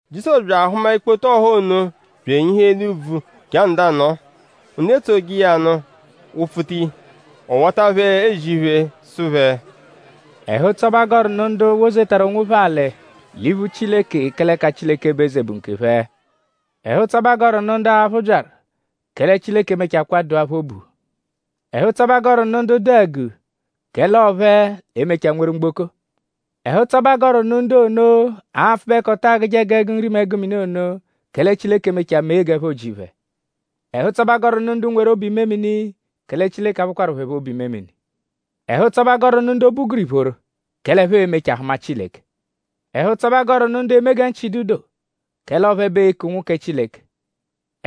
Jizọsu bya ahụma ikpoto ọha ono bya enyihu eli úbvú je anọdu anọo. Ndu etsoje iya nụ wụ-pfuta iya. Ọ wata phẹ ezi iphe sụ phẹ: “Ẹhu-ụtso bẹ a gọru nụ ndu wozetaru onwophẹ alị l'iphu Chileke; kẹle ẹka Chileke bụ eze bụ nkephẹ! Ẹhu-ụtso bẹ a gọru nụ ndu aphụ byaru; Kẹle Chileke e-mechakwaa dụa phẹ obu! Ẹhu-ụtso bẹ a gọru nụ ndu dụ àgù; kẹle ọo phẹ l'e-mechaa nweru mgboko. Ẹhu-ụtso bẹ a gọru nụ ndu ono, apfụbekoto agụje g'ẹgu nri mẹ ẹgu mini ono; kẹle Chileke e-mechaa mee g'ẹpho ji phẹ! Ẹhu-ụtso bẹ a gọru nụ ndu nweru obu-imemini; kẹle Chileke a-phụkwaru phẹ phọ obu-imemini! Ẹhu-ụtso bẹ a gọru nụ ndu obu gụru ìphóró; kẹle ẹphe e-mechaa hụma Chileke! Ẹhu-ụtso bẹ a gọru nụ ndu eme gẹ nchị dụ do; kẹle ọo phẹ bẹ ee-ku ụnwu kẹ Chileke!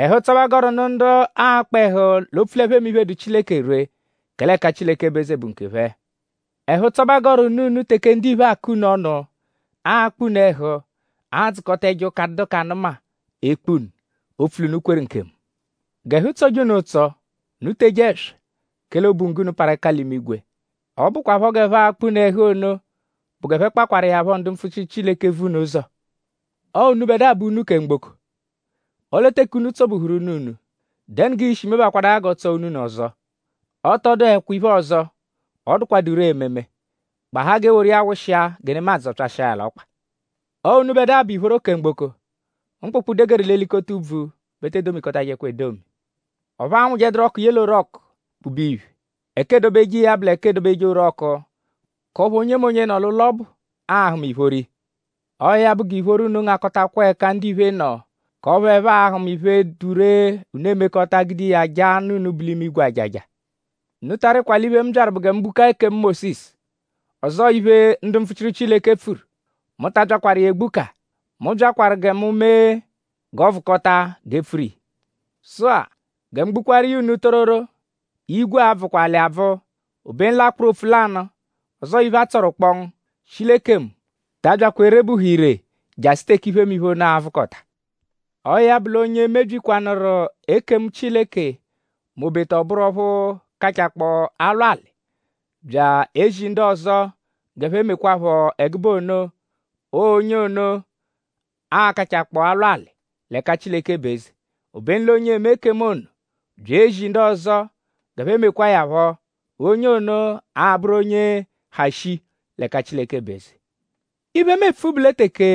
Ẹhu-ụtso bẹ a gọru nụ ndu aakpa ẹhu; l'opfu l'ẹphe eme iphe, dụ Chileke ree; kẹle ẹka Chileke bụ eze bụ nkephẹ! “Ẹhu-ụtso bẹ a gọru nụ unu teke ndiphe nọdu akọ unu ọnu; akpa unu ẹhu; adzụkota ẹjo ụka, adụdu k'anụma ekpu unu opfu l'unu kweru nkemu. G'ẹhu tsọje unu ụtso; unu teje ẹswa; kẹle obunggo unu parụ ẹka l'imigwe. Ọ bụkwapho g'ẹphe akpa unu ẹhu ono bụ g'ẹphe kpakwaru iya phọ ndu mpfuchiru Chileke, vu unu ụzo.” “Ọo unubẹdua bụ únú kẹ mgboko; ọle teke únú tsọ-buhuru únú-únú;?dẹnu g'ii-shi mebakwadaa ya g'ọ tsọ únú-únú ọzo? Ọ tọ dụhekwa iphe ọzo, ọ dụkwadu ree ememe; gbahaa g'e woru iya wụshia gẹ nemadzụ zọpyashia ya l'ọkpa. “Ọo unubẹdua bụ ìphóró kẹ mgboko. Mkpụkpu, degeru l'elikota úbvú bẹ e te domikọtajekwa edomi. Ọphu aanwụjeduru ọku ye l'orọku kpube iya iphe. Ẹka eedobeje iya bụ l'iphe, eedobeje orọku; k'ọphu onyemonye, nọ l'ụlo ọbu a-hụma ìphóró iya. Ọo ya bụ; g'ìphóró unu ngakọtakwa l'ẹka ndiphe nọ; k'ọphu ẹphe a-hụma iphe, dụ ree, unu emekọta gude iya jaa Nna unu, bu l'imigwe ajaja.” “Unu ta arịkwa l'iphe, mu byaru bụ gẹ mu gbukaa ekemu Mósisu; ọzoo iphe, ndu mpfuchiru Chileke pfuru. Mu ta abyakwaru iya egbuka. Mu byakwaru gẹ mu mee g'ọ vụkota g'e pfuru iya. Sụ-a; gẹ mu gbukwaaru iya unu tororo; igwe a-bvụkwa alị abvụ; obenu l'akpụru opfu lanụ ọzoo iphe, a tsọru kpọngu, shi l'ekemu ta abyakwa erebuhu ire jasụ teke iphemiphe ono a-vụkota. Ọo ya bụ l'onye mebyikwanụru ekemu Chileke m'obeta ọ bụru ọphu kachakpọo alwa alị; bya ezi ndu ọzo g'ẹphe mekwaphọ ẹgube ono; ọo onye ono a-kachakpọo alwa alị l'ẹka Chileke bụ eze. Obenu l'onye eme ekemu ono; bya ezi ndu ọzo g'ẹphe mekwa iya phọ; onye ono a-bụru onye ha shii l'ẹka Chileke bụ eze. Iphe, mu epfu bụ lẹ teke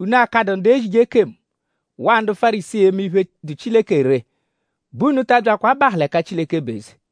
unu akadụ ndu ezije ekemu; waa ndu Fárisii eme iphe, dụ Chileke ree bẹ unu ta abyakwa abahụ l'ẹka Chileke bụ eze.”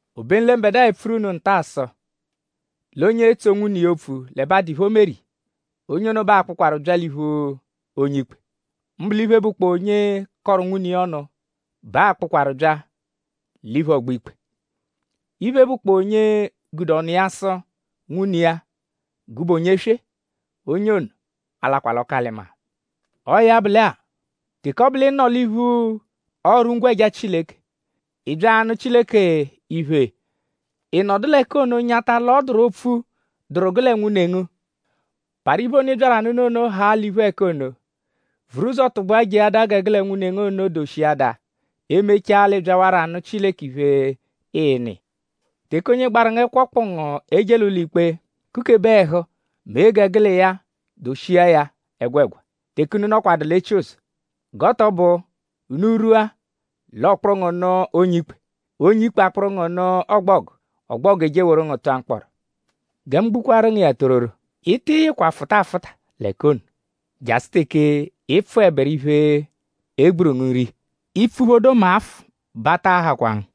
Obenu lẹ mbẹdua epfuru unu nta-a sụ l'onye etso nwune iya opfu l'ẹbe adụ iphe, o meru iya; onye ono bẹ a-kpụkwaru bya l'iphu onye-ikpe. Mbụ l'iphe, bụkpoo onye kọru nwune iya ọnu bẹ a-kpụjekwaru bya l'iphu ọgbo-ikpe. Iphe, bụkpoo onye gude ọnu iya sụ nwune iya: ‘Gụbe onye-eswe-a’; onye ono a-lakwa l'ọku-alị-maa. Ọo ya bụ lẹ-a; teke ọ bụ l'ị nọ l'iphu ọru-ngwẹja Chileke; ị -bya anụ Chileke iphe; ị nọdu l'ẹka ono nyata l'ọ dụru opfu, dụru gẹe nwune ngu; parụ iphe ono, ị byaru anụnu ono haa l'iphu ẹka ono vuru ụzo tụgbua jeadaa gẹ gụ lẹ nwune ngu ono doshiadaa; e -mechaa l'ị byawarọ anụ Chileke iphe, ịinu iya. “Teke onye gbaru ngu ẹkwo kpụ ngu eje l'ụlo-ikpe; kukebe ẹhu mee gẹ gụ l'iya doshia ya ẹgwegwa teke unu nọkwadu l'etsuzọ; g'ọ tọ bụ: unu -rwua l'ọ kpụru ngu nụ onye-ikpe; onye-ikpe akpụru ngu nụ ọgbogu; ọgbogu eje eworu ngu tụa mkpọro. Gẹ mu gbukwaaru ngu iya tororo; Ị tị yịkwa fụta afụta l'ẹka ono jasụ teke ị pfụeberu iphe, e gburu ngu nre iya; ị -pfuphodo mẹ afụ bẹ a taa hakwa ngu.”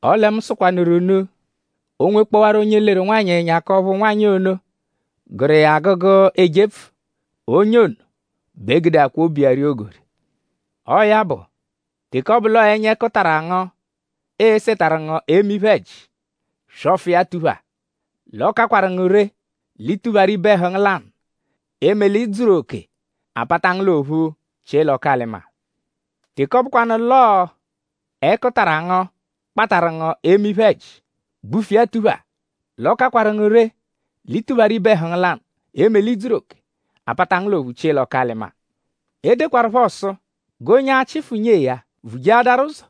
Ọle mu sụkwanuru unu; o -nwekpọwaru onye leru nwanyị ẹnya; k'ọphu nwanyị ono gụru iya agụgu ejepfu; onye ono bẹ gudeakwaa obu iya ria ogori. Ọo ya bụ; teke ọ bụ l'ọo ẹnya ẹkutara ngu esetaru ngu eme iphe-ẹji; swọfu iya tuphaa! L'ọ kakwaru ngu ree l'i tupharu ibe ẹhu ngu lanụ; eme l'i dzuru oke; a pata ngu l'ophu chie l'ọku-alị-maa. Teke ọ bụkwanu l'ọo ẹkutara ngu kpatarụ ngu eme iphe-ẹji; gbufu iya tuphaa. L'ọ kakwaru ngu ree l'i tupharu ibe ẹhu ngu lanụ; eme l'i dzuru oke; a pata ngu l'ophu chie l'ọku-alị-maa.” “E dekwaruphọ sụ g'onye achịfu nyee ya vujeadaru ụzo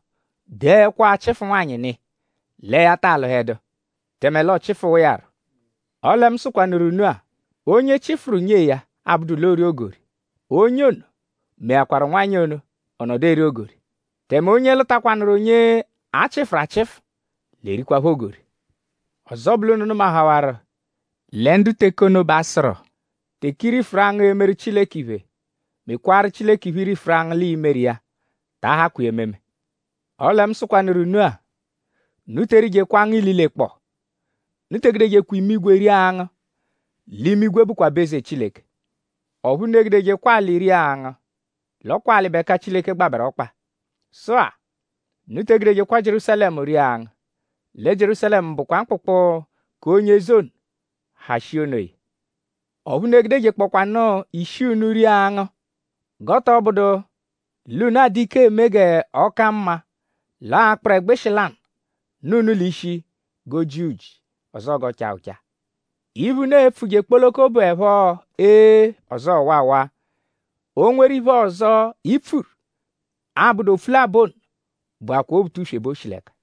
dee ẹkwo-achịfu-nwanyị nụ iya lẹ ya taa lụhedu; tẹme l'ọo-chịfuwa iya rọ. Ọle mu sụkwanuru unu-a: onye chịfuru nyee ya; abụdu l'oori ogori; onye ono meakwaru nwanyị ono; ọ nọdu eri ogori; tẹme onye lụkwanuru onye a chịfuru achịfu l'erikwaphọ ogori.” “Ọzo bụ l'unu nụmahawaru lẹ ndu teke ono bẹ a sụru: ‘Teke i rifuru angụ emeru Chileke iphe; mekwaaru Chileke iphe, i rifuru angụ l'ii-meru iya; ta ahakwa iya ememe.’ Ọle mu sụkwanuru unu-a: unu te erijekwa angụ ililekpọo. Unu te egudejekwa imigwe ria angụ; l'imigwe bụkwa aba-eze Chileke. Ọphu unu egudejekwa alị ria angụ; l'ọ kwa alị bụ ẹka Chileke gbabẹru ọkpa. Sụ-a; unu te egudejekwa Jierúsalẹmu ria angụ; lẹ Jierúsalẹmu bụkwa mkpụkpu k'onye eze ono, ha shii onoya. Ọphu unu egudejekpọkwaanu ishi unu ria angụ; g'ọ tọ bụdu l'unu adụ ike eme g'ọ ka mma l'ọo akpụru ẹgbushi lanụ, nọ unu l'ishi g'o ji uji; ọzoo g'ọ chaa ụcha. Iphe, unu e-pfuje kpoloko bụepho ‘ee’; ọzoo ‘waawaa’. O -nweru iphe ọzo, i pfuru, 'abụdu opfu labọ ono bụakwaa Obutuswe bẹ o shi l'ẹka.”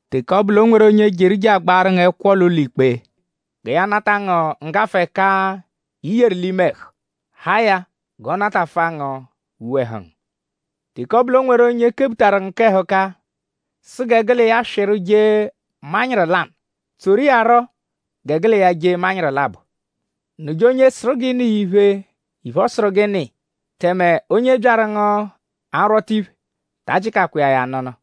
Teke ọ bụ l'o nweru onye jeru je agbaarụ ngu ẹkwo l'ụlo-ikpe gẹ ya nata ngu nggafụ-ẹka, i yeru l'ime ẹhu; haa ya g'ọ natafụa ngu uwe ẹhu ngu. Teke ọ bụ l'o nweru onye kebutaru ngu k'ẹhuka sụ gẹ gụ l'iya swịru jee manyịru lanụ; tsoru iya rọ gẹ gụ l'iya jee manyịru labọ. Nụje onye sụru g'ị nụ iya iphe; iphe, ọ sụru g'ị nụ iya; tẹme onye byaru ngu arwọta iphe; ta ajịkakwa iya ya anụnu.”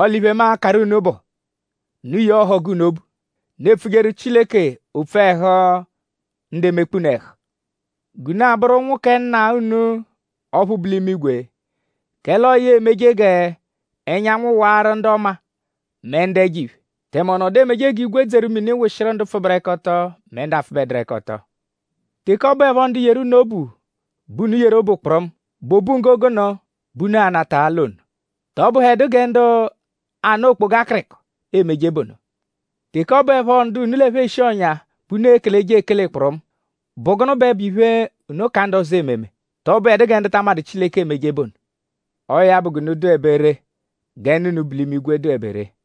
Ọle iphe, mu akaru unu bụ: Unu yee ọhogu unu obu. Unu epfujeru Chileke opfu ẹhu ndu emekpa unu ẹhu; g'unu a-bụru ụnwu kẹ Nna unu ọphu bu l'imigwe. Kẹle ọo ya emeje g'ẹnyanwu waaru ndu ọma mẹ ndu ẹjo-iphe. Tẹme ọ nọdu emeje g'igwe dzeru mini wụshiru ndu pfụberekoto mẹ ndu apfụbeduru-ẹka-ọto. Teke ọ bụepho ndu yeru unu obu bẹ unu yeru obu kpụrumu;?bụ obunggo gụnu bẹ unu a-nata l'ono??Tọ bụhedu gẹ ndu ana okpoga akịriko emeje bụ ono? Teke ọ bụepho ndu unu ẹ phẹ eshi ọ̀nyà bẹ unu ekeleje ekele kpụrumu;?bụ gụnu bẹ bụ iphe, unu ka ndu ọzo ememe??Tọ bụedu gẹ ndu ta amadụ Chileke emeje bụ ono? Ọo ya bụ g'unu dụebe ree gẹ Nna unu, bu l'imigwe dụebe ree.”